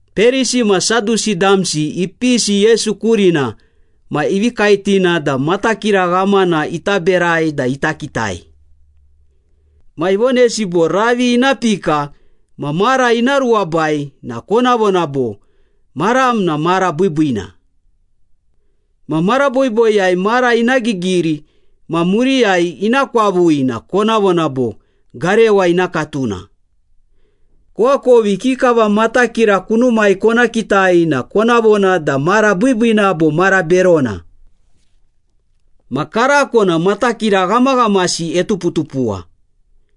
Perisi ma Sadusi damsi ipisi Yesu kurina ma ivi kaetina da matakira ghamana ita berai da ita kitai. Ma ivonesi bo, “Ravi ina pika ma mara ina ruwabai na kona vona bo, ‘Maram na mara biibiina.’ Ma mara boiboiyai mara ina gigiri ma muriyai ina kwavui na kona vona bo, ‘Garewa ina katuna.’ Koakovi ikikava matakira kunumai kona kitai na kona vona da mara biibiina bo mara berona. Ma karako na matakira ghamaghamasi etuputupuwa,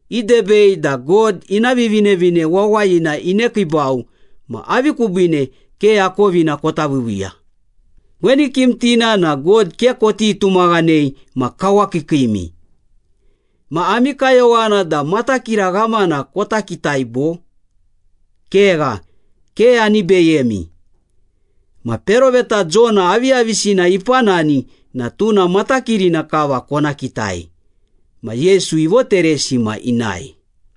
idebei da God ina Vivinevine Wawayina inekiibau ma avi kubiine ke akovina kota viiviiya? Weni kimtina na God ke koti tumaghanei ma kawakiikiimi, ma ami kayowana da matakira ghamana kota kitai, bo? Kegha, ke ani beyemi, ma peroveta Jona aviyavisina ipanani na tuna matakirina kava kona kitai.” Ma Yesu ivoteresi ma inae.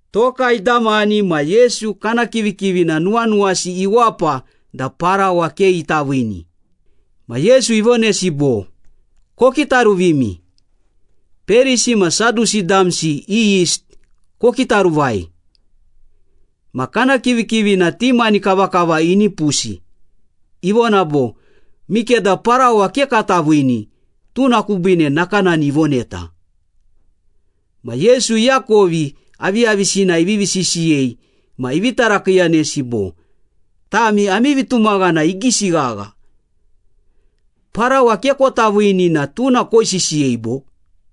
Toka idamani na Yesu kana kivikivina nuwanuwasi iwapa da parawa ke ita viini. Ma Yesu ivonesi bo, “Kokitaruvimi! Perisi ma Sadusi damsi i yist kokitaruvai.” Ma kana kivikivina ti mani kavakava inipusi, ivona bo, “Mikeda parawa ke kata viini, tuna kubiine nakanani ivoneta.” Ma Yesu iakovi aviyavisina ivivi sisiyei ma ivi tarakiiyanesi bo, “Tami ami vitumaghana igisi ghagha. Parawa ke kota viini na tuna koisisiyei, bo?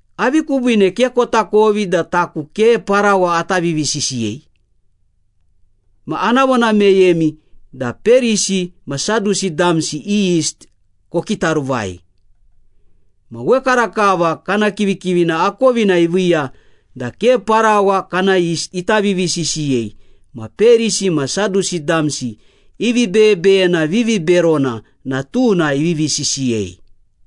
Avi kubiine ke kotakovi da taku ke parawa ata vivisisiyei? Ma ana vona meyemi da Perisi ma Sadusi damsi i yist kokitaruvai.” Ma wekarakava kana kivikivina akovina iviiya da ke parawa kana yist ita vivisisiyei ma Perisi ma Sadusi damsi i vibeyebeyena viviberona na tuna ivivi sisiyei.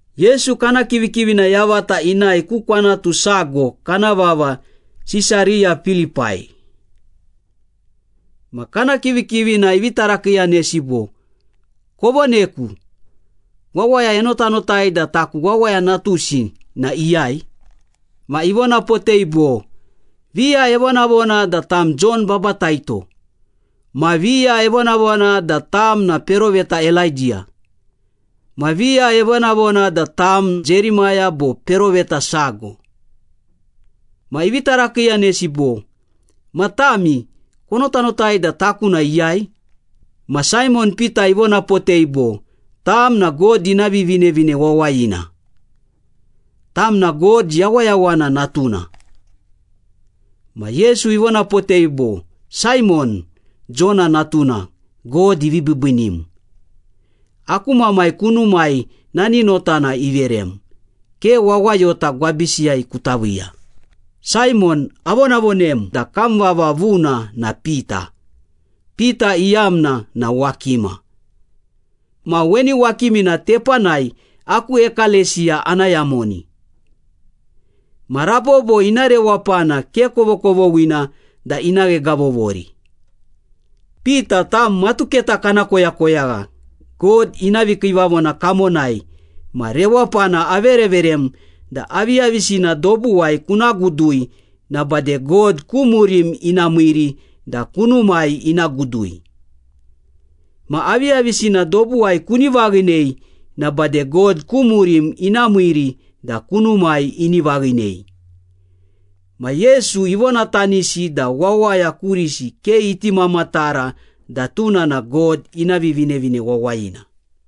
Yesu kana kivikivina yavata inae ku kwanatu sago kana vava Sisariya Pilipai. Ma kana kivikivina ivi tarakiiyanesi bo, “Kovoneku, wawaya enotanotai da taku Wawaya Natusi na iyai?” Ma ivonapotei bo, “Viya evonavona da tam Jon Babataito, ma viya evonavona da tam na peroveta Elaidiya, ma viya evonavona da tam Jerimaya bo peroveta sago.” Ma ivi tarakiiyanesi bo, “Ma tami, konotanotai da taku na iyai?” Ma Saimon Pita ivonapotei bo, “Tam na God ina Vivinevine Wawayina. Tam na God Yawayawana Natuna.” Ma Yesu ivonapotei bo, “Saimon, Jona natuna, God ivi biibiinim. Aku Mamai kunumai nani notana iverem, ke wawayota gwabisiyai kuta viiya. Saimon, avonavonem da kam vava vuna na Pita (Pita iyamna na ‘wakima’). Ma weni wakimina tepanai aku ekalesiya ana yamoni. Ma rabobo ina rewapana ke kovokovoghina da ina ghegavovori. Pita, tam matuketa kana koyakoyagha God ina vikiivavona kamonai ma rewapana avereverem da aviyavisina dobuwai kuna gudui na bade God ku murim ina miiri da kunumai ina gudui. Ma aviyavisina dobuwai kuni vaghinei na bade God ku murim ina miiri da kunumai ini vaghinei.” Ma Yesu ivonatanisi da wawaya kurisi ke iti mamatara da tuna na God ina Vivinevine Wawayina.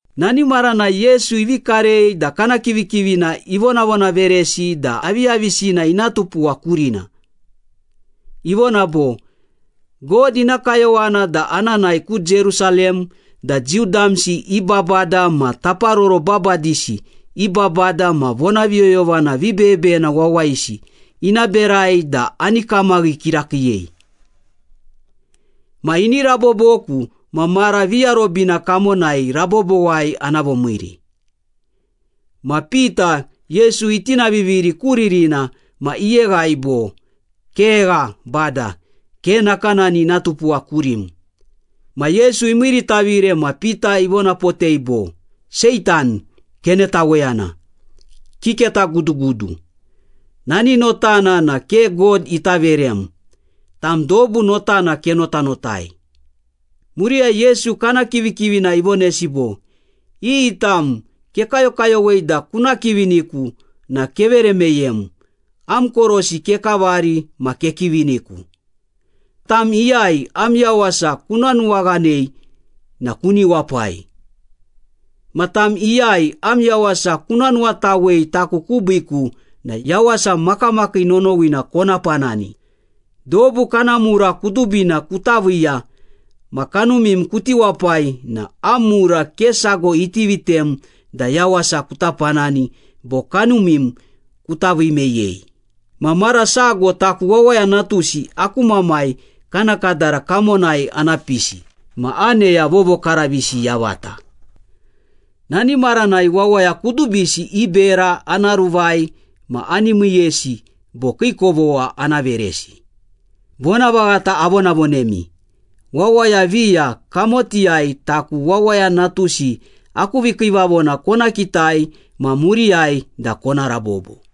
Nani maranai Yesu ivi karei da kana kivikivina ivonavonaveresi da aviyavisina ina tupuwa kurina. Ivona bo, “God ina kayowana da ana nae ku Jerusalem da Jiu damsi i babada ma taparoro babadisi i babada ma vonaviyoyovana vibeyebeyena wawayisi ina berai da ani kamaghi kirakiiyei. Ma ini raboboku ma mara viarobina kamonai rabobowai ana vomiiri.” Ma Pita, Yesu itinaviviri ku ririna ma iyeghai bo, “Kegha, Bada! Ke nakanani ina tupuwa kurim!” Ma Yesu imiiritavire ma Pita ivonapotei bo, “Seitan, kenetaweyana! Kiketagudugudu! Nani notana na ke God ita verem, tam dobu notana kenotanotai.” Muriyai Yesu kana kivikivina ivonesi bo, “Iyi tam kekayokayowei da kuna kiviniku na kevere meyem, am korosi kekavari ma kekiviniku. Tam iyai am yawasa kuna nuwaghanei na kuni wapai. Ma tam iyai am yawasa kuna nuwatawei taku kubiiku na yawasa makamakii nonowina kona panani. Dobu kana mura kudubina kuta viiya ma kanumim kuti wapai na am mura ke sago iti vitem da yawasa kuta panani bo kanumim kuta vii meyei. Ma mara sago taku Wawaya Natusi aku Mamai kana kadara kamonai ana pisi, ma aneya vovokaravisi yavata. Nani maranai wawaya kudubisi i bera ana ruvai ma ani miiyesi bo kii kovogha ana veresi. Vonavaghata avonavonemi, wawaya viya kamotiyai taku Wawaya Natusi aku vikiivavona kona kitai ma muriyai da kona rabobo.”